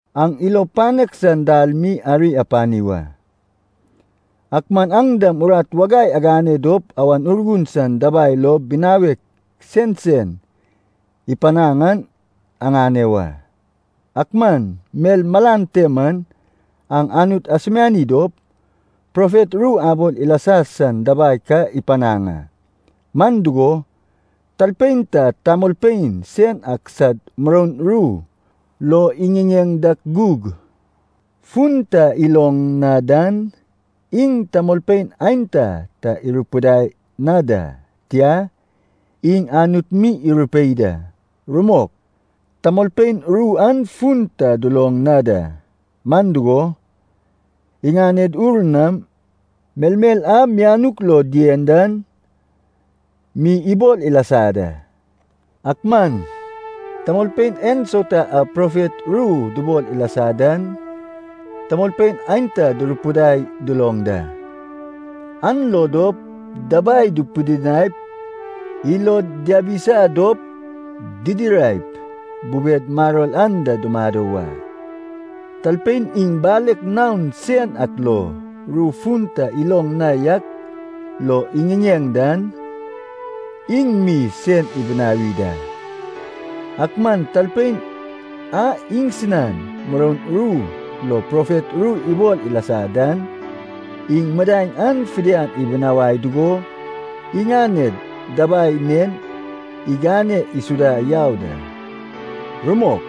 Aŋ ilo panek san dal mi ari apani wa. Ak man aŋ dam urat wagai agane dop Awan Urgun san dabai lo binawek sensen ipanaŋ an aŋane wa. Ak man mel malan te man aŋ Anut asumiani dop, profet ru abol ilasa san dabai ka ipanaŋ a. Man dugo, talpein ta tamolpein sen ak sad muroun ru lo iŋiŋeŋ dak gug, fun ta iloŋ na dan, iŋ tamolpein aenta ta irupidai na da, tia, iŋ Anut mi irupei da. Rumok, tamolpein ru an fun ta duloŋ na da, man dugo, iŋanen ur nam melmel a mianuk lo dien dan mi ibol ilasa da. Ak man, tamolpein ensauta a profet ru dubol ilasa dan, tamolpein aenta durupidai duloŋ da, an lo dop dabai dupidinaip, ilod diabisa dop didiraip bubed maror anda dumado wa. Talpein iŋ balek naon sen ak lo, ru fun ta iloŋ na yak lo iŋiŋeŋ dan, iŋ mi sen ibinawi da. Ak man talpein a iŋsinan muroun ru lo profet ru ibol ilasa dan, iŋ midaeŋ an fidian ibinawai dugo iŋaned dabai nen igane isuda yau da. Rumok,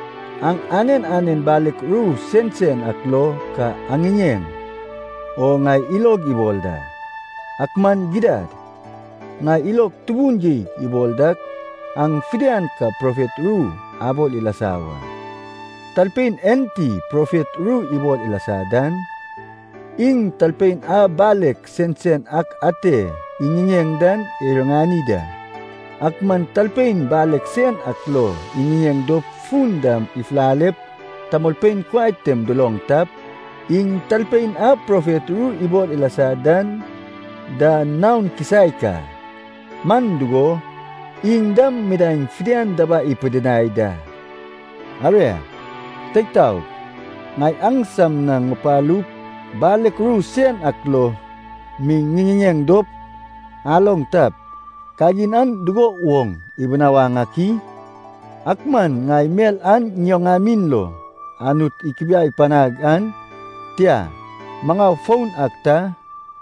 aŋ anen anen balek ru sensen ak lo ka aŋiŋeŋ o ŋai ilog ibol da. Ak man gidad, ŋai ilog tubun geig ibol dak aŋ fidian ka profet ru abol ilasa wa. Talpein enti profet ru ibol ilasa dan, iŋ talpein a balek sensen ak ate iŋiŋeŋ dan iriŋani da. Ak man talpein balek sen ak lo iŋiŋeŋ dop fun dam ifulalep tamolpein kuai tem duloŋ tap, iŋ talpein a profet ru ibol ilasa dan da naon kisaek a, man dugo, iŋ dam midaeŋ fidian dabai ipidinai da. Aria, teig taog, ŋai aŋsam na ŋupalup balek ru sen ak lo mi ŋiŋiŋeŋ dop aloŋ tap, kagin an dugo woŋ ibinawaŋ ak i? Ak man ŋai mel ta ŋioŋamin lo Anut ikubiai panag an, tia, maŋau foun ak ta,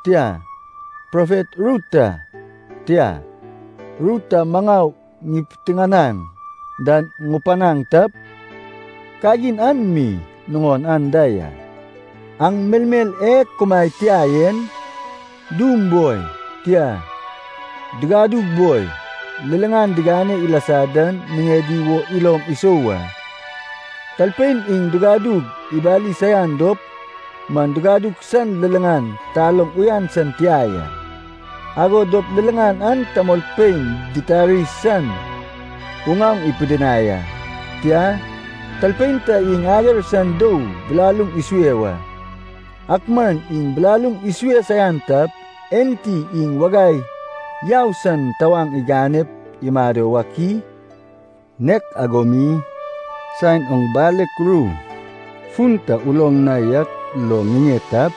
tia, profet ru ta, tia, ru ta maŋau ipiteŋanaŋ dan ŋupanaŋ tap, kagin an mi nuŋon anda ya. Aŋ melmel e kumaed tia en, dum boi, tia, digadug boi, liliŋan digane ilasa dan niŋedi wo ilom isou wa. Talpein iŋ digadug ibali saian dop man digadug san liliŋan taloŋ uyan san tia ya, ago dop liliŋan an tamolpein ditari san uŋaoŋ ipidinai a. Tia, talpein ta iŋ ager san dou bilaluŋ isue wa, ak man iŋ bilaluŋ isue saian tap, enti iŋ wagai yau san tawaŋ iganep imado wak i? Nek ago mi, saen oŋ balek ru fun ta uloŋ na yak lo ŋiŋeŋ tap,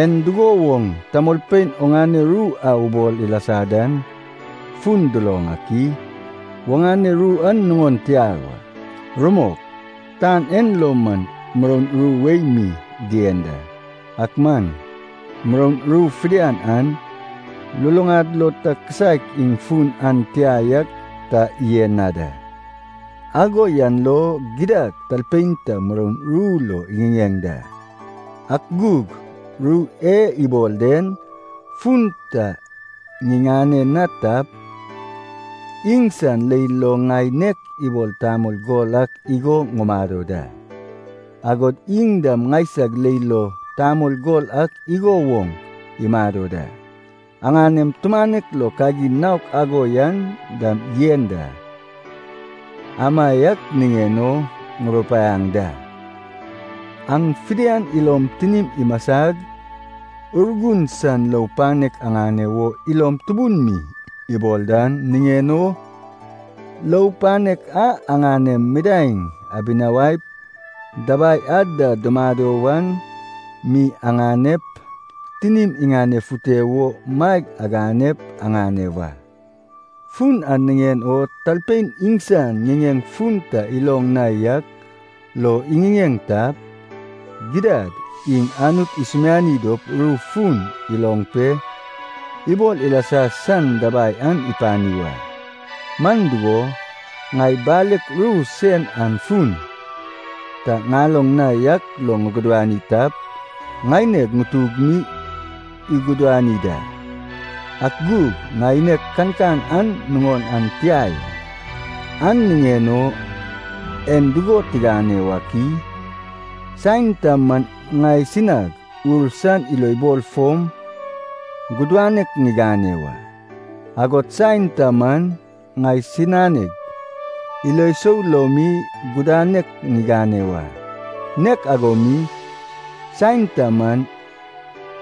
en dugo woŋ tamolpein oŋane ru a ubol ilasa dan fun duloŋ ak i? Oŋane ru an nuŋon tia wa. Rumok, tan en lo man muroun ru wei mi dien da, ak man muroun ru fidian an luluŋad lo ta kisaek iŋ fun an tia yak ta yen na da. Ago yan lo, gidad talpein ta muroun ru lo iŋiŋeŋ da, ak gug ru e ibol den fun ta ŋiŋane na tap, iŋsan leil lo ŋai nek ibol tamol gol ak igo ŋumado da, agod iŋ dam ŋaisag leil lo tamol gol ak igo woŋ imado da. Aŋanem tumanek lo kagin naok ago yan dam yen da. Amaiak niŋen o ŋurupaiaŋ da, aŋ fidian ilom tinim imasag, Urgun san lou panek aŋane wo ilom tubun mi ibol dan niŋen o, lou panek a aŋanem midaeŋ dibinawaip dabai ad da dumado wan mi aŋanep, tinim iŋanefute wo maeg aganep aŋane wa. Fun an niŋen o talpein iŋsan ŋiŋeŋ fun ta iloŋ na yak lo iŋiŋeŋ tap, gidad iŋ Anut isumiani dop ru fun iloŋ pe ibol ilasa san dabai an ipani wa. Man dugo, ŋai balek ru sen an fun ta ŋaloŋ na yak lo ŋugudani tap, ŋaineg ŋutug mi igudani da, ak gug ŋaineg kankan an nuŋon an tia ya. An niŋen o en dugo tigane wak i? Saen ta man ŋaisinag ur san ilobol fom gudanek ŋigane wa. Agod saen ta man ŋaisinag ilo sou lo mi gudanek ŋigane wa. Nek ago mi, saen ta man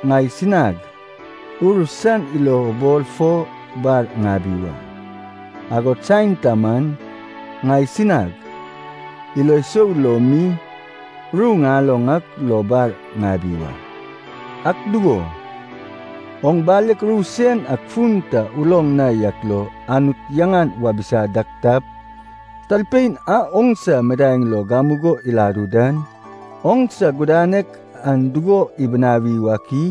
ŋaisinag ur san ilobol fom bar ŋabi wa, agod saen ta man ŋaisinag ilo sou lo mi ru ŋaloŋ ak lo bar ŋabi wa. Ak dugo, oŋ balek ru sen ak fun ta uloŋ na yak lo Anut yaŋan wabisa dak tap, talpein a oŋsa midaeŋ lo gamugo iladu dan, oŋsa gudanek an dugo ibinawi wak i?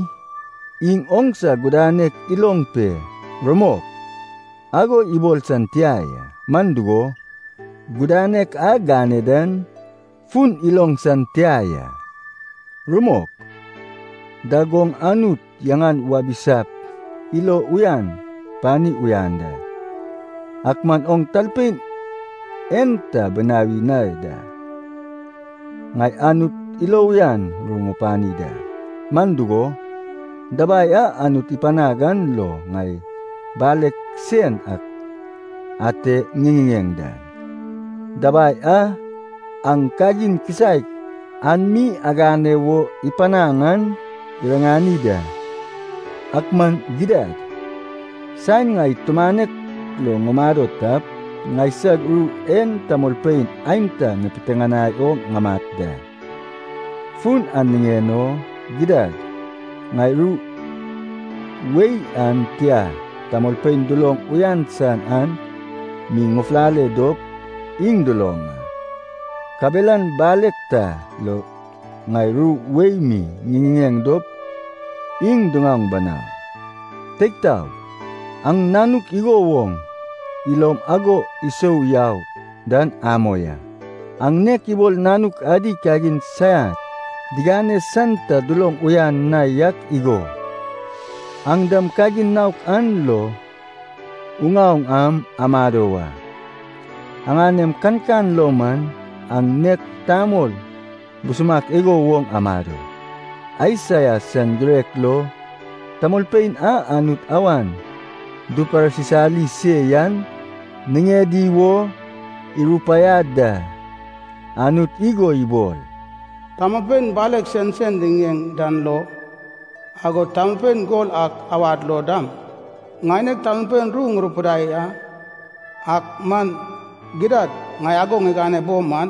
Iŋ oŋsa gudanek iloŋ pe “rumok” ago ibol san tia ya, man dugo, gudanek a gane dan fun iloŋ san tia ya. Rumok, dag oŋ Anut yaŋan wabisap ilo uyan pani uyan da, ak man oŋ talpein en ta binawi na da. Ŋai Anut ilo uyan ru ŋupani da, man dugo, dabai a Anut ipanag an lo ŋai balek sen ak ate ŋiŋiŋeŋ dan, dabai a aŋ kagin kisaek an mi agane wo ipanaŋ an iriŋani da. Ak man gidad, saen ŋai tumanek lo ŋumado tap, ŋaisag ru en tamolpein aenta ipiteŋanai o ŋamat da. Fun an niŋen o gidad ŋai ru wei an tia tamolpein duloŋ uyan san an mi ŋufulale dop iŋ duloŋ a, kabelan balek ta lo ŋai ru wei mi ŋiŋiŋeŋ dop iŋ diŋaoŋ banau. Teig taog, aŋ nanuk igo woŋ ilom ago isou yau dan amoi a. Aŋ nek ibol nanuk adi kagin saiak digane san ta duloŋ uyan na yak igo, aŋ dam kagin naok an lo uŋaoŋ am amado wa. Aŋanem kankan lo man, aŋ nek tamol busumak igo woŋ amado. Aisaia san girek lo tamolpein a Anut awan duparsisali se yan niŋedi wo irupaiad da. Anut igo ibol, “Tamolpein balek sensen diŋiŋeŋ dan lo, agod tamolpein gol ak awad lo dam, ŋaineg tamolpein ru ŋurupidai a. Ak man gidad ŋai ago ŋigane bo man,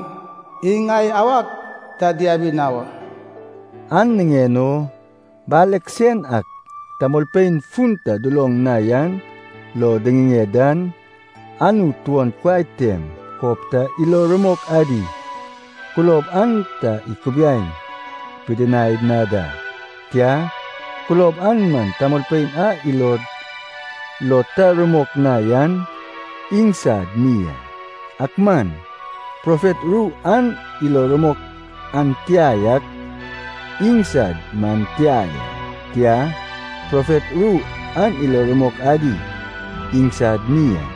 iŋ ŋai awag ta diabi na wa.” An niŋen o, balek sen ak tamolpein fun ta duloŋ na yan lo diŋiŋeŋ dan, Anut tuon kuai tem kob ta ilo rumok adi kulob an ta ikubiai pidinai na da, tia, kulob an man tamolpein a ilod lo ta rumok na yan iŋsad mi a. Ak man, profet ru an ilo rumok an tia yak iŋsad man tia ya, tia, profet ru an ilo rumok adi iŋsad mi a.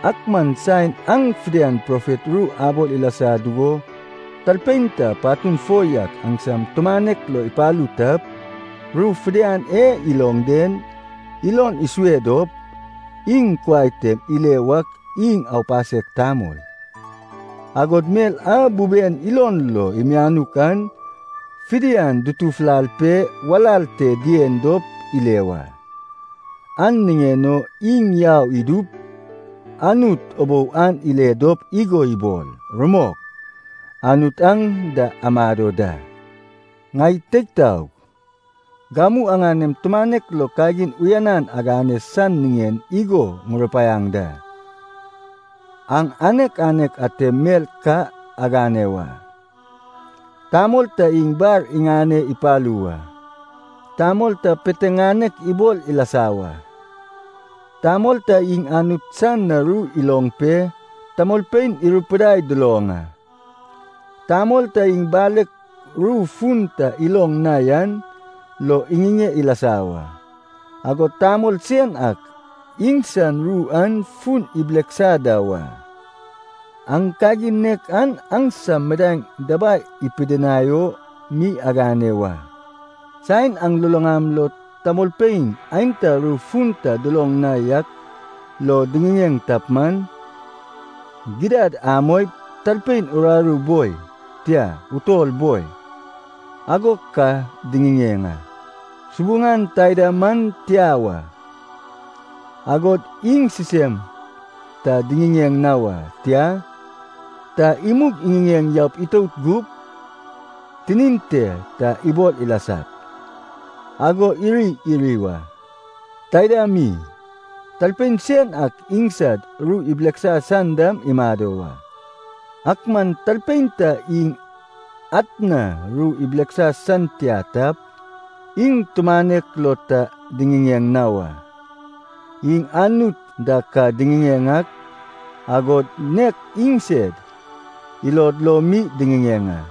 Ak man saen aŋ fidian profet ru abol ilasa dugo talpein ta patun fo yak aŋsam tumanek lo ipalu tap, ru fidian e iloŋ den ilon isue dop iŋ kuai tem ile wak iŋ aupasek tamol. Agod mel a buben ilon lo imianuk an fidian dutufulal pe walal te dien dop ile wa. An niŋen o iŋ yau idup Anut ubou an ile dop igo ibol, “Rumok, Anut aŋ da amado da!” Ŋai teig taog, gamu aŋanem tumanek lo kagin uyanan agane san niŋen igo ŋurupaiaŋ da. Aŋ anek anek atem mel ka agane wa. Tamol ta iŋ bar iŋane ipalu wa, tamol ta piteŋanek ibol ilasa wa, tamol ta iŋ Anut san na ru iloŋ pe tamolpein irupidai duloŋ a, tamol ta iŋ balek ru fun ta iloŋ na yan lo iŋiŋeŋ ilasa wa, agod tamol sen ak iŋsan ru an fun ibileksa da wa. Aŋ kagin nek an aŋsam midaeŋ dabai ipidinai o mi agane wa. Saen aŋ luluŋam lo tamolpein aenta ru fun ta duloŋ na yak lo diŋiŋeŋ tap man, gidad amoip talpein uraru boi, tia, utol boi, ago ka diŋiŋeŋ a, subuŋan taida man tia wa. Agod iŋ sisem ta diŋiŋeŋ na wa, tia, ta imug iŋiŋeŋ yaup itout gup, tinin te ta ibol ilasap, ago iri iri wa. Taida mi, talpein sen ak iŋsad ru ibileksa san dam imado wa. Ak man talpein ta iŋ atna ru ibileksa san tia tap, iŋ tumanek lo ta diŋiŋeŋ na wa. Iŋ Anut da ka diŋiŋeŋ ak, agod nek iŋsed ilod lo mi diŋiŋeŋ a.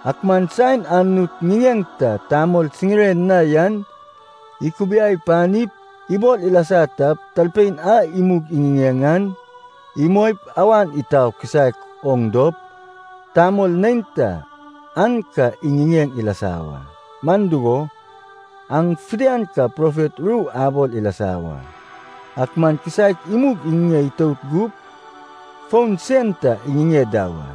Ak man saen Anut ŋiŋeŋ ta tamol siŋire na yan ikubiai panip ibol ilasa tap, talpein a imug iŋiŋeŋ an imoip awan itau kisaek oŋ dop, tamol neinta an ka iŋiŋeŋ ilasa wa. Man dugo, aŋ fidian ka profet ru abol ilasa wa, ak man kisaek imug iŋiŋeŋ itout gup, fon sen ta iŋiŋeŋ da wa.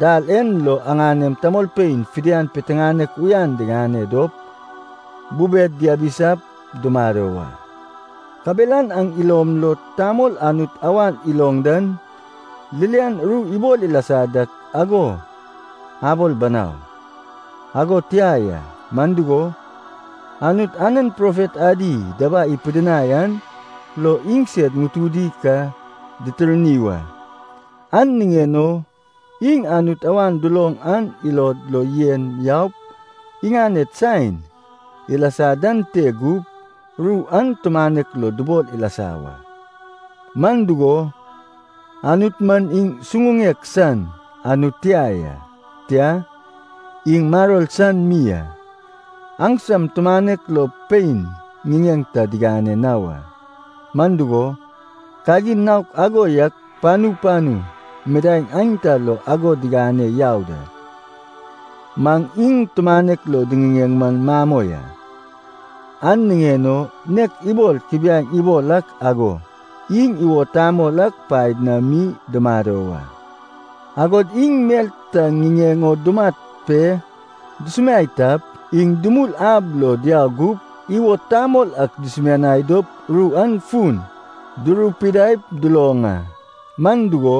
Dal en lo aŋanem tamolpein fidian piteŋanek uyanan diŋane dop, bubed yabisap dumado wa. Kabelan aŋ ilom lo tamol Anut awan iloŋ dan ririan ru ibol ilasa dak ago abol banau, ago tia ya. Man dugo, Anut anen profet adi dabai ipidinai an lo iŋsed ŋutudi ka ditirni wa. An niŋen o iŋ Anut awan duloŋ an ilod lo yen yaup iŋaned saen ilasa dan te gup, ru an tumanek lo dubol ilasa wa. Man dugo, Anut man iŋ suŋuŋek san Anut tia ya, tia, iŋ maror san mi a. Aŋsam tumanek lo pein ŋiŋeŋ ta digane na wa. Man dugo, kagin naok ago yak panu panu midaeŋ aenta lo ago digane yau da. Maŋ iŋ tumanek lo diŋiŋeŋ man mamoi a. An niŋen o nek ibol kubiaeŋ ibol ak ago, iŋ iwod tamol ak paed na mi dumado wa. Agod iŋ mel ta niŋen o dumat pe dusumiai tap, iŋ dumul ab lo diau gup iwod tamol ak dusumianai dop ru an fun durupidaip duloŋ a. Man dugo,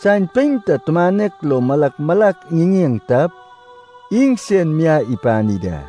saen pein ta tumanek lo malak malak iŋiŋeŋ tap, iŋsen miai ipani da.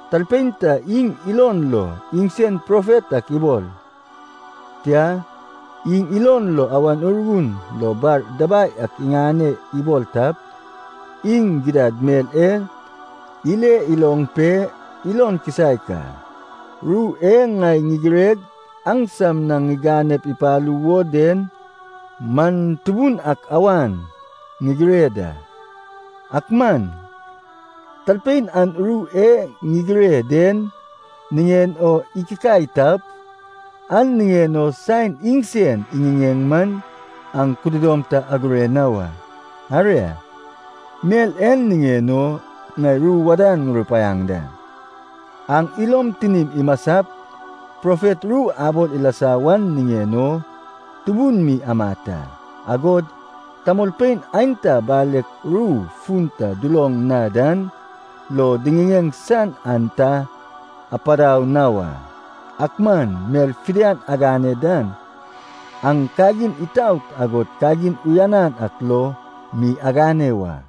Talpein ta iŋ ilon lo iŋsen profet ak ibol, tia, iŋ ilon lo Awan Urgun lo bar dabai ak iŋane ibol tap, iŋ gidad mel en ile iloŋ pe ilon kisaek a, ru e ŋai ŋigireg aŋsam na ŋiganep ipalu wo den man Tubun ak awan ŋigire da. Ak man talpein an ru e ŋigire den niŋen o ikikai tap, an niŋen o saen iŋsen iŋiŋeŋ man aŋ kududom ta agure na wa. Aria, mel en niŋen o ŋai ru wadan ŋurupaiaŋ da. Aŋ ilom tinim imasap profet ru abol ilasa wan niŋen o tubun mi amat a. Agod tamolpein aenta balek ru fun ta duloŋ na dan lo diŋiŋeŋ san aŋ ta apadau na wa. Ak man mel fidian agane dan aŋ kagin itaot agod kagin uyanan ak lo mi agane wa.